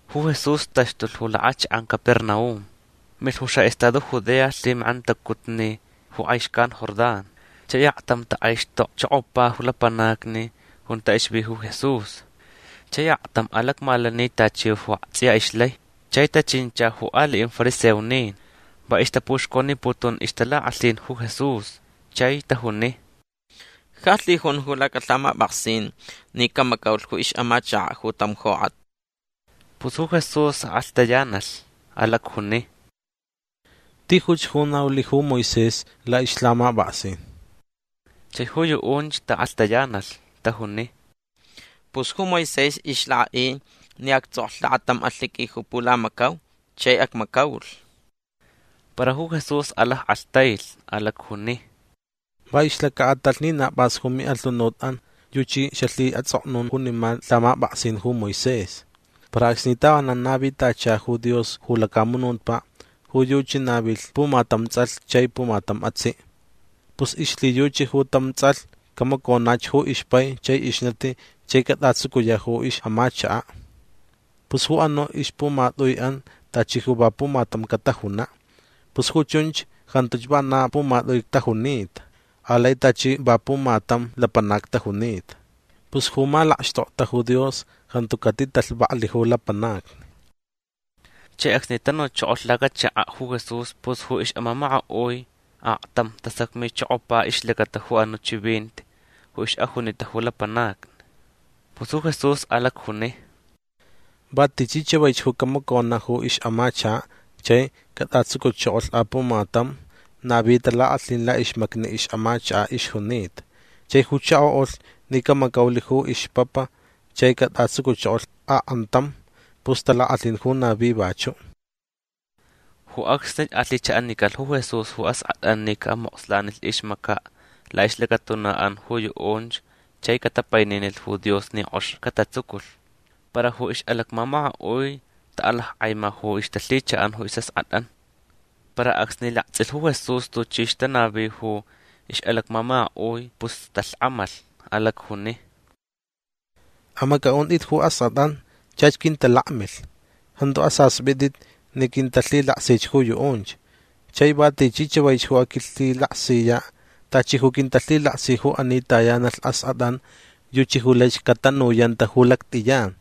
Ju Jesús taxtulh ju lakʼachakʼan Capernaum. Milh ju xaʼestado Judea lhimakʼantacutni ju kʼai xcan Jordán. Chai aktam takʼaixtokchokopa ju lapanacni junta ixvi ju Jesús. Chai aktam alacmalani tachi ju aktsʼiya ixlai. Chai tachincha ju aliʼin fariseonin. Va ixtapuxconiputun ixtalakʼalhin ju Jesús. Chai tajuni: ―Ja lhijun ju lhamapʼaksin ni camacaulh ju ixʼamachakaʼ ju tam jokʼat. Pus ju Jesús akʼalhtayanalh. Alacjuni: ―Tijuch ju naulh ju Moisés laʼixlhamapʼaksin. Chai ju yuʼunch taʼakʼalhtayanalh. Tajuni: ―Pus ju Moisés ixlakʼaʼi ni actsʼoklh lakatam alhiqui ju pulamacau chai acmacaulh. Para ju Jesús alackʼalhtailh. Alacjuni: ―Va ixlacaʼatalh ni na pʼas ju miʼalhunutʼan yuchi xalhiʼatsʼoknun junima lhamapʼaksin ju Moisés. Para acsni tavanan navitacha ju Dios ju lacamunutpaʼ ju yuchi navilh pumatam tsʼalh chai pumatam atsiʼ. Pus ixlhiyuchi ju tam tsʼalh camaconach ju ixpai chai ixnati chai catʼatsucuyaʼ ju ixʼamachakaʼ. Pus ju anuʼ ixpumatʼuiʼan tachi ju va pumatam catajunaʼ. Pus ju chunch jantuch vana pumatʼui tajunita. Alai tachi va pumatam lapanac tajunita. Pus ju malakxtokta ju Dios jantu catitalhvaklh ju lapanacni. Chai acsni tanuchokolh lacachakaʼ ju Jesús pus ju ixʼamamakaʼui aktam tasacmichokopa ixlacata ju anuʼ chivinti ju ixʼajunita ju lapanacni. Pus ju Jesús alacjuni: ―Va tichi chavaich ju camaconaʼ ju ixʼamachakaʼ chai catʼatsucuchokolh apumatam navi talakʼalhin laʼixmacni ixʼamachakaʼ ixjunita. Chai ju chakoʼulh ni camacaulh ju ixpapa chai catʼatsucuchokolh akʼantam pus talakʼalhin ju navi vachuʼ. Ju acsnich alhichaʼanicalh ju Jesús ju askʼatʼan ni caʼamokslanilh ixmacaʼ laʼixlacatunaʼan ju yuʼunch chai catapaininilh ju Dios ni kʼox catatsuculh. Para ju ixʼalacmamakaʼui taʼalackʼaima ju ixtalhichaʼan ju isʼaskʼatʼan. Para acsni laktsʼilh ju Jesús tuchi ixtanavi ju ixʼalacmamakaʼui pus talhkʼamalh. Alacjuni: ―Amacʼaʼuntʼit ju askʼatʼan. Chach quintalakmilh. Jantu asaspʼitʼit ni quintalhilaksich ju yuʼunch. Chai va tichi chavaich ju aquilhilaksiyaʼ tachi ju quintalhilaksi ju ani tayanalh askʼatʼan yuchi ju laich catanuyanta ju lactʼiyan.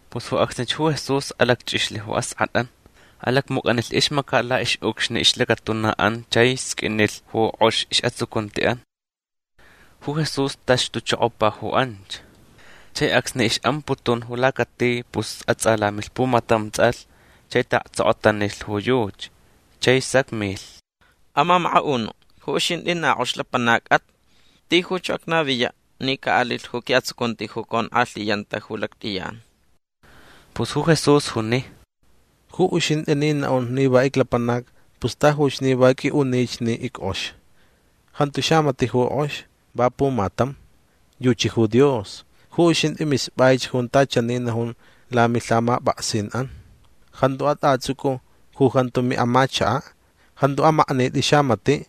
Pus ju acsnich ju Jesús alacchʼixlh ju askʼatʼan. Alacmucʼanilh ixmacaʼ laʼixʼucxni ixlacatunaʼan chai sqʼuinlh ju kʼox isʼatsucuntiʼan. Ju Jesús taxtuchokopa ju anch. Chai acsni ixʼamputun ju lacati pus atsʼalamilh pumatam tsʼalh chai taʼaktsokotanilh ju yuchi. Chai sacmilh: ―Amamakaʼunuʼ ju uxintʼi na kʼox lapanacʼat. Tijuch ju acnaviyaʼ ni caʼalilh ju quiʼatsucunti ju conkʼalhiyanta ju lactʼiyan. Pus ju Jesús juni: ―Ju uxintʼi ni naʼun ni va iclapanac pus tajuch ni va qʼuiʼunich ni ickʼox. Jantu xamatiʼ ju kʼox. Va pumatam. Yuchi ju Dios. Ju uxintʼi mispʼaich junta chani najun lamilhamapʼaksinʼan: “Jantu atʼatsʼucʼu ju jantu miʼamachakaʼ. Jantu amaknitʼi xamatiʼ.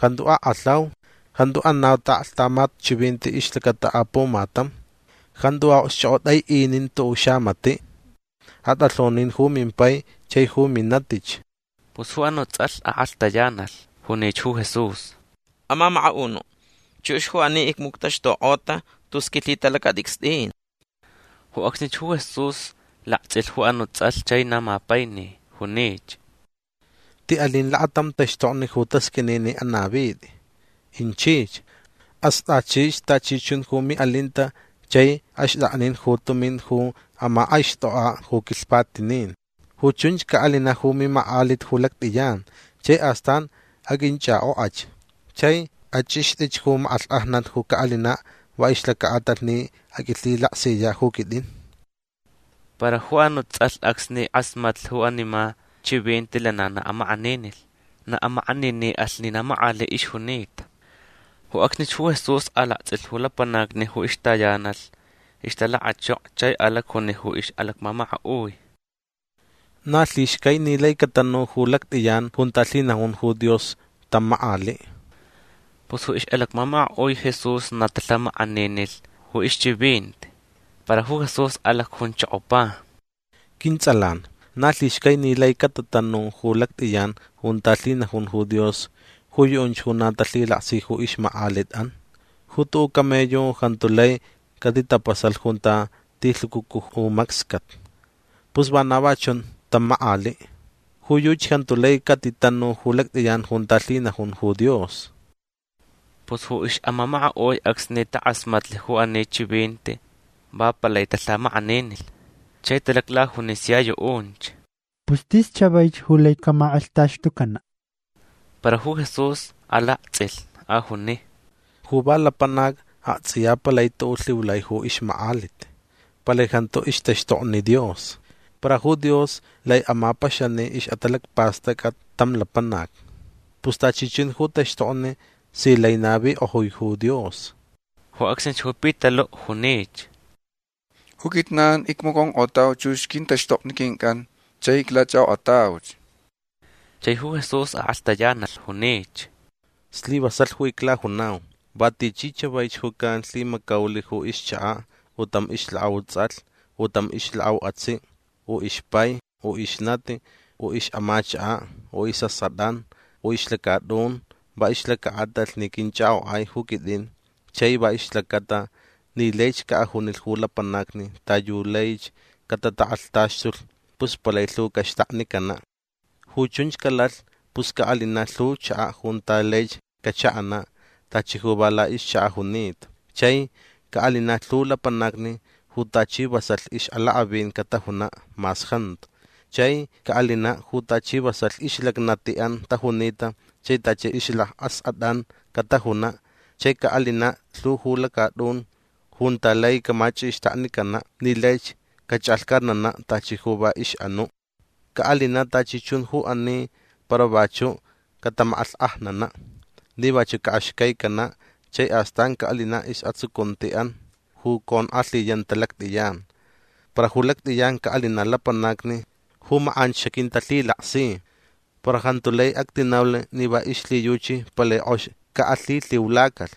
Jantu akʼalhaun. Jantu anau taʼaklhtamat chivinti ixlacata apumatam. Jantu aʼokxchʼokʼotʼaiʼinitʼi tuʼuʼ xamatiʼ. Atʼalhonin ju mimpai chai ju minatich”. Pus ju anuʼ tsʼalh akʼalhtayanalh. Junich ju Jesús: ―Amamakaʼunuʼ. Chux ju ani icmuctaxtukʼota tus quilhitalacatʼicstʼin. Ju acsnich ju Jesús laktsʼilh ju anuʼ tsʼalh chai na mapaini. Junich: ―Tiʼalin lakatam taxtokni ju tasqʼuini ni anavitʼi. Inchich. Astʼachich tachi chun ju miʼalinta chai axtʼaknin ju tumin ju amakʼaixtʼokʼaʼ ju quilhpatinin. Ju chunch caʼalinaʼ ju mimakʼalit ju lactʼiyan. Chai astan aqʼuinchʼakʼokʼach. Chai achʼixtʼich ju makʼalhkʼajnat ju caʼalinaʼ va ixlacaʼatalh ni aquilhilaksiyaʼ ju quitʼin. Para ju anuʼ tsʼalh acsni kʼasmatlh junima chivinti lana na amakʼaninilh. Na amakʼaniniʼalh ni na makʼaliʼ ixjunita. Ju acsnich ju Jesús alaktsʼilh ju lapanacni ju ixtayanalh ixtalakachoko chai alacjuni ju ixʼalacmamakaʼui: ―Na lhixcai ni lai catanu ju lactʼiyan junta lhinajun ju Dios tam makʼaliʼ. Pus ju ixʼalacmamakaʼui Jesús na talhamakʼaninilh ju ixchivinti. Para ju Jesús alacjunchokopa: ―Quintsʼalan na lhixcai ni lai catatanu ju lactʼiyan junta lhinajun ju Dios ju yuʼunch ju na talhilaksi ju ixmakʼalitʼan. Ju tuʼuʼ camello jantu lai catitapasalh junta tilhucucu ju macscat. Pus vana va chun tam makʼaliʼ. Ju yuchi jantu lai catitanun ju lactʼiyan junta lhinajun ju Dios. Pus ju ixʼamamakaʼui acsni takʼasmatlh ju ani chivinti va palai talhamakʼaninilh. Chai talaclajuni sia yuʼunch. ―Pus tis chavaich ju lai camakʼalhtaxtucanaʼ. Para ju Jesús alaktsʼilh. Ajuni: ―Ju va lapanac aktsʼiya palai tuʼuʼ lhiulai ju ixmakʼalit. Palai jantu ixtaxtokni Dios. Para ju Dios lai amapaxani ixʼatalacpastʼacʼat tam lapanac. Pus tachi chun ju taxtokni si lai navikʼojui ju Dios. Ju acsnich ju Pitaluʼ junich: ―Ju quijnan icmaconkʼotauch chux quintaxtokni quincʼan chai iclachʼakʼokʼatauch. Chai ju Jesús akʼalhtayanalh. Junich: ―Slivasalh ju iclajunau. Va tichi chavaich ju calhimacaulh ju ixchakaʼ u tam ixlakʼau tsʼalh u tam ixlakʼau atsiʼ u ixpai u ixnati u ixʼamachakaʼ u isʼaskʼatʼan u ixlacatʼun va ixlacaʼatalh ni quinchʼakʼokʼai ju quitʼin chai va ixlacata ni laich caʼajunilh ju lapanacni ta yu laich catatakʼalhtaxtulh pus palai lhu caxtaknicanaʼ. Ju chunch calalh pus caʼalinaʼ lhu chakaʼ junta laich cachaʼanaʼ tachi ju va laʼixchakaʼ junita. Chai caʼalinaʼ lhu lapanacni ju tachi vasalh ixʼalakʼavin catajunaʼ mas jantu. Chai caʼalinaʼ ju tachi vasalh ixlacnatiʼan tajunita chai tachi ixlacʼaskʼatʼan catajunaʼ. Chai caʼalinaʼ lhu ju lacatʼun junta lai camachʼixtaknicanaʼ ni laich cachʼalhcatnanaʼ tachi ju va ixʼanuʼ. Caʼalinaʼ tachi chun ju ani para vachuʼ catamakʼalhkʼajnanaʼ ni vachuʼ caʼaxcaicanaʼ. Chai astan caʼalinaʼ isʼatsucuntiʼan ju conkʼalhiyanta lactʼiyan. Para ju lactʼiyan caʼalinaʼ lapanacni ju makʼanch xaquintalhilaksi. Para jantu lai actinaulh ni va ixlhiyuchi palai kʼox caʼalhilhiulacalh.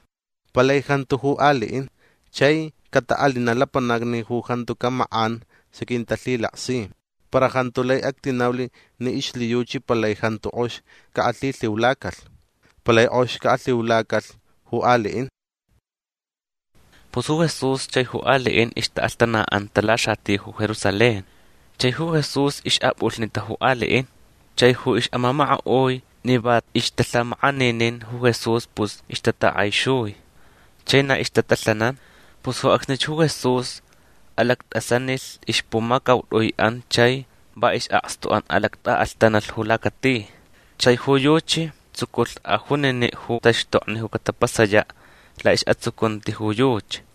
Palai jantu ju aliʼin. Chai cataʼalinaʼ lapanacni ju jantucaʼ makʼan xaquintalhilaksi. Para jantu lai actinaulh ni ixlhiyuchi palai jantu kʼox caʼalhilhiulacalh. Palai kʼox caʼalhiulacalh ju aliʼin. Pus ju Jesús chai ju aliʼin ixtaʼalhtanaʼanta laxati ju Jerusalén. Chai ju Jesús ixʼapʼulhnita ju aliʼin. Chai ju ixʼamamakaʼui ni va ixtalhamakʼaninin ju Jesús pus ixtatakʼaixui. Chai na ixtatalhanan. Pus ju acsnich ju Jesús alactʼasanilh ixpumacautʼuiʼan chai va isʼakstuʼan alactʼaʼalhtanalh ju lacati. Chai ju yuchi tsuculh ajuniniʼ ju taxtokni ju catapasayaʼ laʼisʼatsucunti ju yuchi.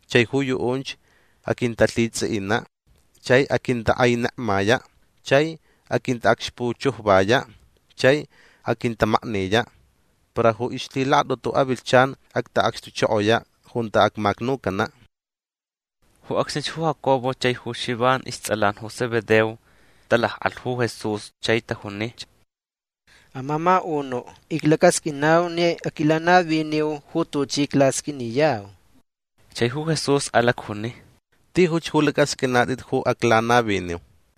Chai ju yuʼunch aquintalhitsʼiʼinaʼ. Chai aquintakʼainekmayaʼ. Chai aquintaʼacxpuchujvayaʼ. Chai aquintamakniyaʼ. Para ju ixlhilakatʼutu avilhchan actaʼacxtuchokoyaʼ junta acmacnucanaʼ. Ju acsnich ju Jacobo chai ju Xivan istsʼalan ju Zebedeo talakʼalh ju Jesús chai tajunich: ―Amamakaʼunuʼ iclacasqʼuinau ni aquilanaviniu ju tuchi aclasqʼuiniyau. Chai ju Jesús alacjuni: ―Tijuch ju lacʼasqʼuinatʼit ju aclanaviniu.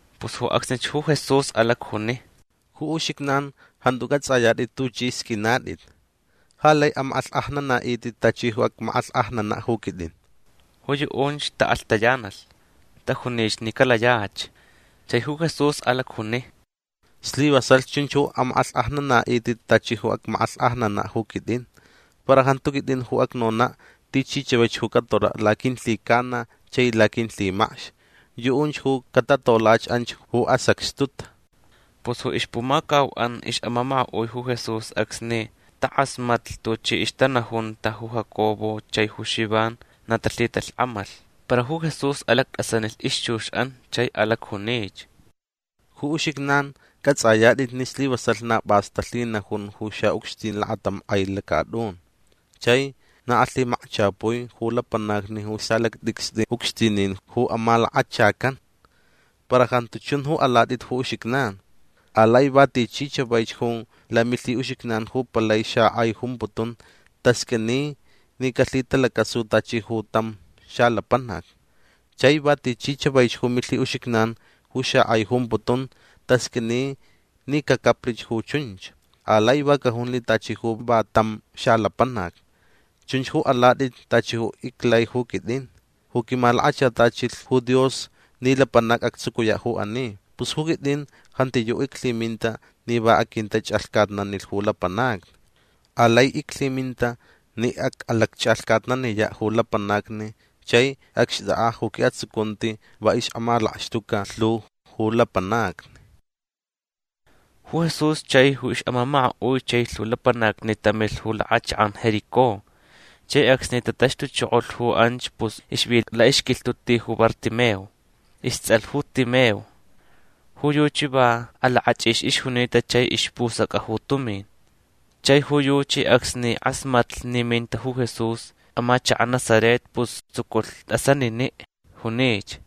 Pus ju acsnich ju Jesús alacjuni: ―Ju uxijnan jantu cʼatsʼayatʼit tuchʼi sqʼuinatʼit. Ja lai amakʼalhkʼajnanaʼitʼit tachi ju acmakʼalhkʼajnanaʼ ju quitʼin. Ju yuʼunch taʼakʼalhtayanalh. Tajunich ni calayach. Chai ju Jesús alacjuni: ―Slivasalh chunch ju amakʼalhkʼajnanaʼitʼit tachi ju acmakʼalhkʼajnanaʼ ju quitʼin. Para jantu quitʼin ju acnonaʼ tichi chavaich ju catolaʼ laquilhicana chai laquilhimacx. Yuʼunch ju catatolach anch ju asacxtuta. Pus ju ixpumacauʼan ixʼamamakaʼui ju Jesús acsni takʼasmatlh tuchi ixtanajunta ju Jacobo chai ju Xivan na talhitalhkʼamalh. Para ju Jesús alactʼasanilh ixchuxʼan chai alacjunich: ―Ju uxijnan cʼatsʼayatʼit ni slivasalh na pʼas talhinajun ju xaʼucxtin lakatam kʼai lacatʼun. Chai na alhimacchapui ju lapanacni ju salactʼicstʼi ucxtinin ju amalakachacan. Para jantu chun ju alatʼit ju uxijnan. Alai va tichi chavaich ju lamilhiʼuxijnan ju palai xakʼai jumputun tasqʼuini ni calhitalacasu tachi ju tam xalapanac. Chai va tichi chavaich ju milhiʼuxijnan ju xakʼai jumputun tasqʼuini ni cacaplich ju chunch. Alai va cajunlh tachi ju va tam xalapanac. Chunch ju alatʼit tachi ju iclai ju quitʼin ju quimalakachatachilh ju Dios ni lapanac actsucuyaʼ ju ani. Pus ju quitʼin jantiyuʼ iclhiminta ni va aquintachʼalhcatnanilh ju lapanacni. Alai iclhiminta ni acʼalacchʼalhcatnaniyaʼ ju lapanacni chai acxtʼakʼaʼ ju quiʼatsucunti va ixʼamalakxtuca lhu ju lapanacni. Ju Jesús chai ju ixʼamamakaʼui chai lhu lapanacni tamilh ju lakʼachakʼan Jericó. Chai acsni tataxtuchokolh ju anch pus ixvi laʼixquilhtuʼ ti ju Bartimeo. Istsʼalh ju Timeo. Ju yuchi va alakʼachʼix ixjunita chai ispusacʼa ju tumin. Chai ju yuchi acsni kʼasmatlh ni minta ju Jesús amachakaʼ Nazaret pus tsuculh tʼasaniniʼ. Junich: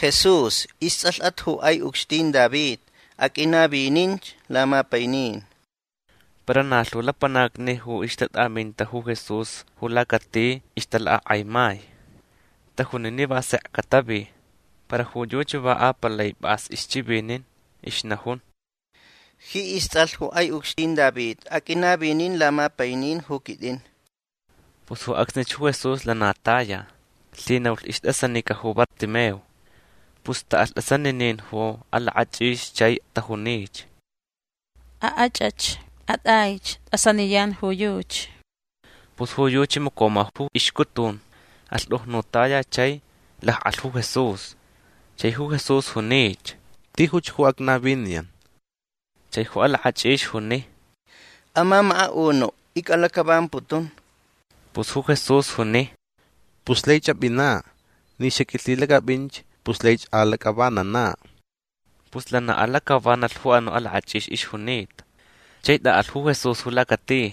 ―Jesús. Istsʼalhʼat ju kʼai ucxtin David. Aqʼuinavininch lamapainin. Para na lhu lapanacni ju ixtatʼaminta ju Jesús ju lacati ixtalakʼakʼaimai. Tajuni ni va sekch catavi. Para ju yuchi va apalai pʼas ixchivinin. Ixnajun: ―Ji istsʼalh ju kʼai ucxtin David aqʼuinavinin lamapainin ju quitʼin. Pus ju acsnich ju Jesús lana taya. Lhinaulh istʼasanica ju Bartimeo. Pus taʼalh tʼasaninin ju alakʼachʼix chai tajunich: ―Akʼachʼach. Atʼaich. Tʼasaniyan ju yuchi. Pus ju yuchi macoma ju ixcutun. Alhtujnutaya chai lakʼalh ju Jesús. Chai ju Jesús junich: ―Tijuch ju acnaviniyan. Chai ju alakʼachʼix juni: ―Amamakaʼunuʼ icʼalacʼavamputun. Pus ju Jesús juni: ―Pus laich apʼinaʼ. Ni xaqʼuilhilacʼapʼinch pus laich alacʼavananaʼ. Pus lana alacʼavanalh ju anuʼ alakʼachʼix ixjunita. Chai tʼaʼalh ju Jesús ju lacati.